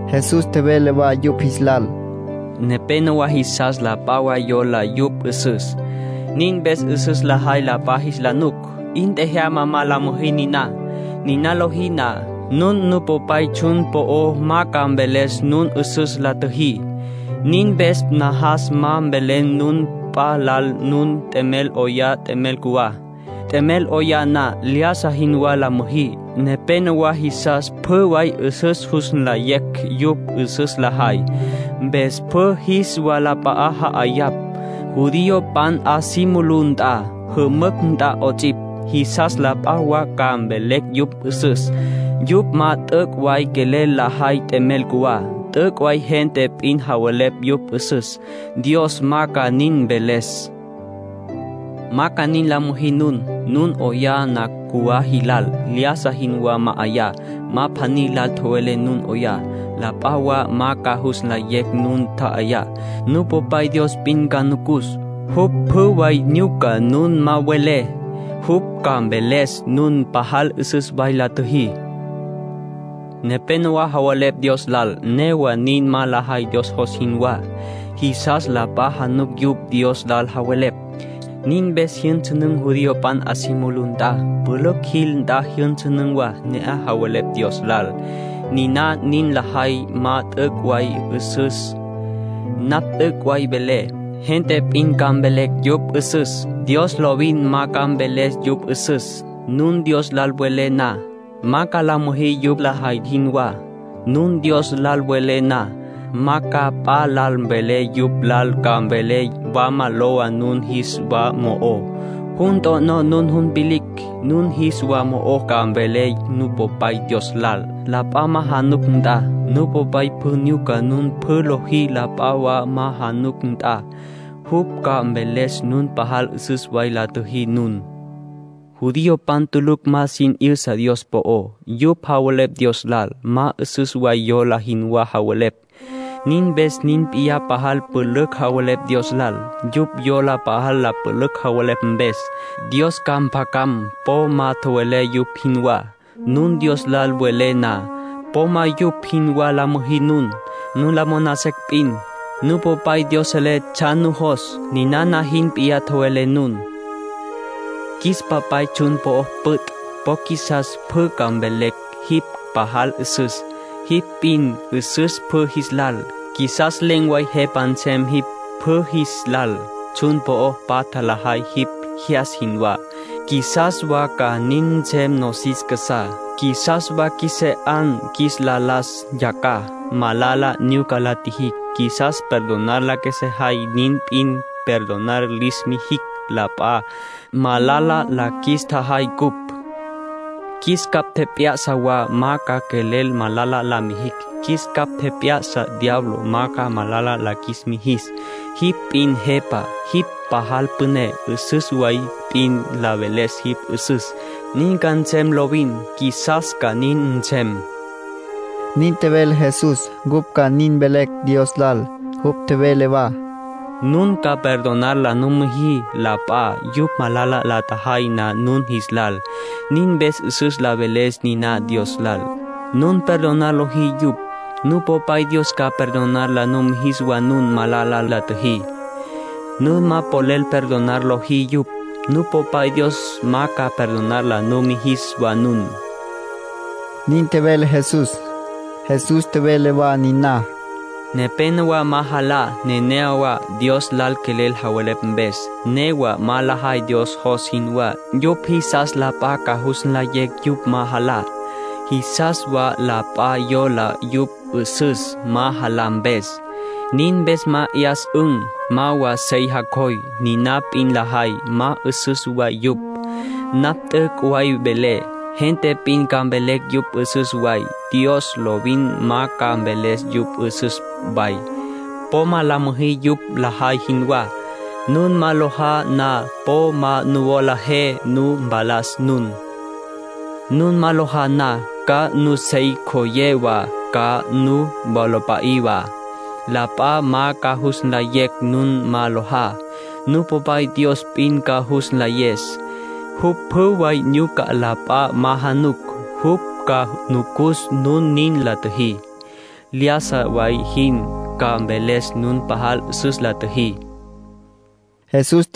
Jesús tjevele wa yupj jis lal: “Nepénowa jisas la p'a wa yola yupj 'üsüs. Nin mpes 'üsüs lajay la p'a jis la nuc. 'In tjajama ma la müjí niná. Niná lojí na, nun Nupopay tsjun po'o ma ca mveles nun 'üsüs la tjüjí. Nin mpes najas ma mvelé nun p'a lal nun t'emel 'oyá t'emel cjuwá. T'emel 'oyá na, lyájasa jinwá la müjí. Nepénowa jisas pjü way jus nlayecj yupj 'üsüs lajay, mpes pjü jis walap'a'á ja'ayapj, judiopan 'a si mulú nt'a, jümücj nt'a 'ots'ipj. Jisas la p'a wa ca mvelecj yupj 'üsüs. Yupj ma t'üc' way quelel lajay t'emel cjuwá. T'üc' way gente p'in javelepj yupj 'üsüs. Dios ma ca nin mveles. Ma ca nin la müjí nun. Nun 'oyá na cjuwá jilal, lyájasa jinwá ma'ayá. Ma pjaní lal tjowelé nun 'oyá. La p'a wa ma ca jus nlayecj nun tja'ayá. Nupopay Dios p'in ca nucus. Jupj pjü way nyuca nun ma welé. Jupj ca mveles nun pajal 'üsüs way la tjüjí. ”Nepénowa javelepj Dios lal, newa nin ma lajay Dios jos jinwá. Jisas la p'a januc yupj Dios lal javelepj. Nin mpes jyünsünün̈ judiopan 'a si mulú nt'a, pülücj jil nt'a jyünsünün̈ wa, ne'aj javelepj Dios lal. Niná nin lajay, ma t'üc' way 'üsüs. Napj t'üc' way velé. Gente p'in ca mvelecj yupj 'üsüs. Dios lovin ma ca mveles yupj 'üsüs. Nun Dios lal welé na, ma ca la müjí yupj lajay jinwá. Nun Dios lal welé na, ma ca p'a lal mvelé jupj lal ca mvelé. Wama lowa nun jis wa mo'ó. Jun t'o'nó jun vilicj. Nun jis wa mo'ó ca mvelé Nupopay Dios lal, la p'a ma januc nt'a. Nupopay pjü nyuca nun pjü lojí la p'a wa ma januc nt'a. Jupj ca mveles nun pajal 'üsüs way la tjüjí nun. ”Judiopan tulucj ma sin 'yüsa Dios po'ó. Yupj javelepj Dios lal, ma 'üsüs way yola jinwá javelepj. Nin mpes nin p'iyá pajal pülücj javelepj Dios lal. Yupj yola pajal la pülücj javelepj mpes, Dios ca mpjacam. Po ma tjowelé yupj jinwá, nun Dios lal welé na. Po ma yupj jinwá la müjí nun. Nun la moná secj p'in, Nupopay Dios selé tsjan nujos. Ninana jin p'iyá tjowelé nun: ‘Qjuis Papay, tsjun po'o püt'. Po qjuisas pjü ca mvelecj jipj pajal 'üsüs. Jipj p'in 'üsüs pjü jis lal. Qjuisas len̈ way Jepa nsem jipj pjü jis lal. Tsjun po'o patja lajay jipj jyas jinwá. Qjuisas wa ca nin nsem nosis casá. Qjuisas wa qjuesé 'an qjuis la las yacjaj. Malala nyuca la tjijicj, qjuisas perdonar la qjuesejay. Nin p'iyá perdonar lis tjijicj la p'a, malala la qjuis tjajay cupj. Qjuis capj tjep'ya'sa wa ma ca quelel malala la mijicj. Qjuis capj tjep'ya'sa diablo ma ca malala la qjuis mijis. Jipj p'in Jepa. Jipj pajal püné. 'Üsüs way p'in la veles jipj 'üsüs. Nin ca nsem lovin. Qjuisas ca nin nsem.’” Nin tjevele Jesús, cupj ca nin mvelecj Dios lal. Jupj tjevele wa: “Nun ca perdonar la müjí la p'a, yupj malala la tjajay na nun jis lal. Nin mpes 'üsüs la veles niná Dios lal. Nun perdonar lojí yupj, Nupopay Dios ca perdonar la mijis wa nun malala la tjüjí. Nun ma quelel perdonar lojí yupj, Nupopay Dios ma ca perdonar la nu mijis wa nun”, nin tjevele Jesús. Jesús tjevele wa niná: “Nepénowa ma jalá neneyawá, Dios lal quelel javelepj mpes. Newa ma lajay Dios jos jinwá. Yupj jisas la p'a ca jus nlayecj yupj ma jalá. Jisas wa la p'a yola yupj 'üsüs, ma jalá mpes. Nin mpes ma 'yas'ün̈, ma wa sey jacjoy. Niná p'in lajay, ma 'üsüs way yupj. Napj t'üc' way velé. Gente p'in ca mvelecj yupj 'üsüs way. Dios lovin ma ca mveles yupj 'üsüs way. Po ma la müjí yupj lajay jinwá. Nun ma lojá na, po ma nuwola je nu tapalas nun. Nun ma lojá na, ca nusey ncjoyé wa, ca nuwola mpa'í wa. La p'a ma ca jus nlayecj nun ma lojá. Nupopay Dios p'in ca jus nlayes. Jupj pjü way nyuca la p'a ma januc. Jupj ca nucus nun nin la tjüjí lyájasa way jin, ca mveles nun pajal 'üsüs la tjüjí”, nin tjevele Jesús.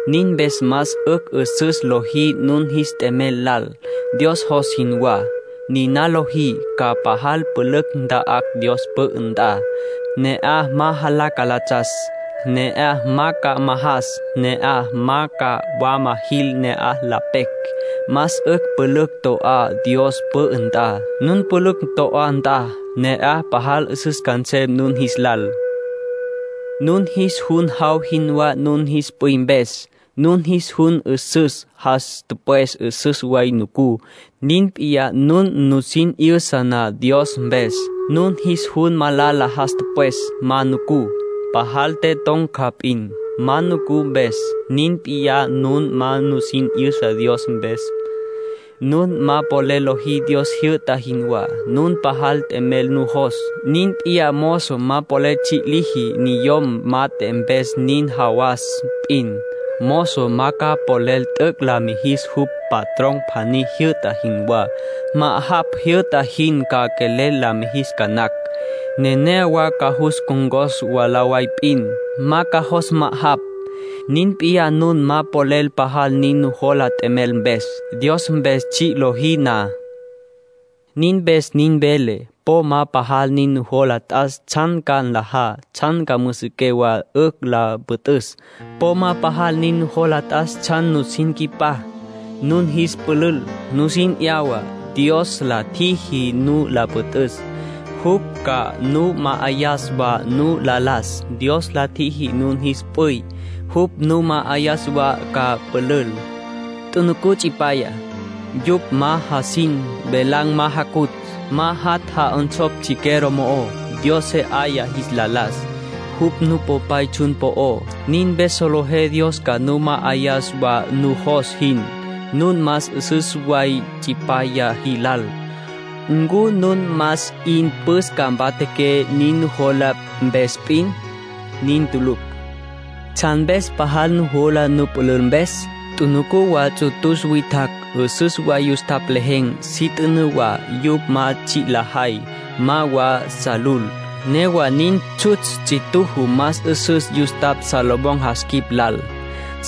Nin mpes más 'ücj 'üsüs lojí nun jis t'emel lal, Dios jos jinwá. Niná lojí, ca pajal pülücj nta'á Dios pü'ü nt'a. Ne'aj ma jalá calatsas. Ne'aj ma ca majas. Ne'aj ma wama jil ne'aj la pecj. Más 'ücj pülücj to'á Dios pü'ü nt'a. Nun pülücj to'á nt'a, ne'aj pajal 'üsüs ca nsem nun jis lal. ”Nun jis jun jaw jinwá nun jis p'üy mpes. Nun jis jun 'üsüs, jas tüpwes 'üsüs way nucú. Nin p'iyá nun nusin 'yüsa na Dios mpes. Nun jis jun malala, jas tüpwes ma nucú. Pajal te ton̈ca p'in, ma nucú mpes. Nin p'iyá nun ma nusin 'yüsa na Dios mpes. ”Nun ma polel lojí Dios jyü'ta jinwá, nun pajal t'emel nujos. Nin p'iyá mozo ma polel tsji' liji niyom mat'e mpes nin jawas p'in. Mozo ma ca quelel t'üc' la mijis jupj patrón pjaní tjijyü'ta jinwá. Ma'ajapj tjijyü'ta jin ca quelel la mijis ca nacj. Nenéyawa ca cus ncon̈cos mwalá way p'in. Ma ca jos ma'ajapj. Nin p'iyá nun ma polel pajal nin nujola t'emel mpes, Dios mpes tsji' lojí na. ”Nin mpes nin velé, po ma pajal nin nujola t'as tsjan ca nlajá, tsjan ca müsiqué wa 'ücj la püt'üs. Po ma pajal nin nujola t'as tsjan nusin nqui'pá nun jis pülül, nusin 'yawa. Dios la tjiji nu la püt'üs. Jupj ca nu ma'ayas wa nu la las. Dios la tjiji nun jis p'üy. Jupj nu ma'ayas wa ca pülül. Tjunucú tsipyaya. Yupj ma jasin. Velan̈ ma jacutj. Ma jat' ja'onsopj chiquero mo'ó. Dios se 'aya jis la las. Jupj Nupopay tsjun po'ó. Nin mpes solejé Dios ca nu ma'ayas wa nujos jin. Nun más 'üsüs way tsipyaya jilal. ¿Ncu nun más 'in püs ca mpatjaqué, nin nujola mpes p'in? Nin tulucj. ”¿Tsjan mpes pajal nujola nupülül mpes? Tjunucú wa ts'utus witjacj. 'Üsüs way yustapj lejen̈, si t'ünǘ wa. Yupj ma tsji' lajay. Ma wa sa lul. Newa nin, tsjutsj ts'ituju más 'üsüs yustapj Salomón jas quip lal.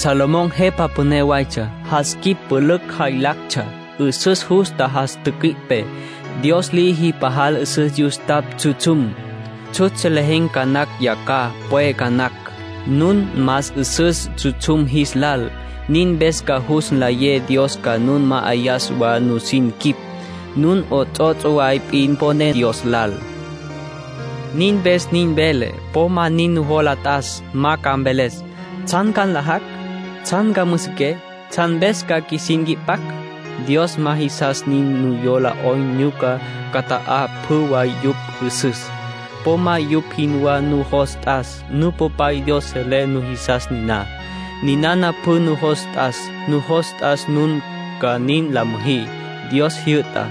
Salomón jepa püné waytsja. Jas quip pülücj jaylactsja. 'Üsüs justa jas tücüi'pe. Dios liji pajal 'üsüs yustapj tsjutsjum. Tsjutsj lejen̈ ca nacj yacjaj. Ya pwe ca nacj. Nun más 'üsüs tsjutsjum jis lal. Nin mpes ca jus nlayé Dios ca nu ma'ayas wa nusin quip. Nun 'ots'ots' way p'in poné Dios lal. Nin mpes nin velé, po ma nin nujola t'as. Ma ca mvelé: ¿Tsjan ca nlajacj? ¿Tsjan ca müsiquecj? ¿Tsjan mpes ca qjuisin nqui'pacj? Dios ma jisas nin yola 'oyn nyuca cüta'acj pjü way yupj jisas. Po ma yupj jinwá nujos t'as. Nupopay Dios selé nujisas niná. Ninana p'in nujos t'as: nujos t'as nun ca nin la müjí Dios jyü'tá.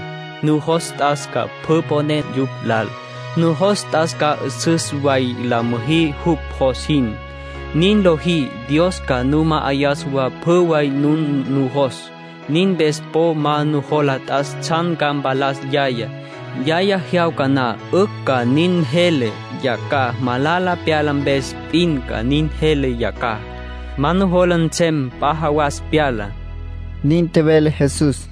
Nujos t'as ca pjü mponé jupj lal. Nujos t'as ca 'üsüs way la müjí jupj jos jin. Nin lojí, Dios ca nu ma'ayas wa pjü way nun nujos. Nin mpes po ma nujola t'as tsjan ca mpalas yayá. Yaya tjejyawca na 'ücj ca nin jele. Yacjaj malala pyala mpes p'in ca nin jele yacjaj. Ma nujola nsem p'a jawasa pyalá”, nin tjevele Jesús.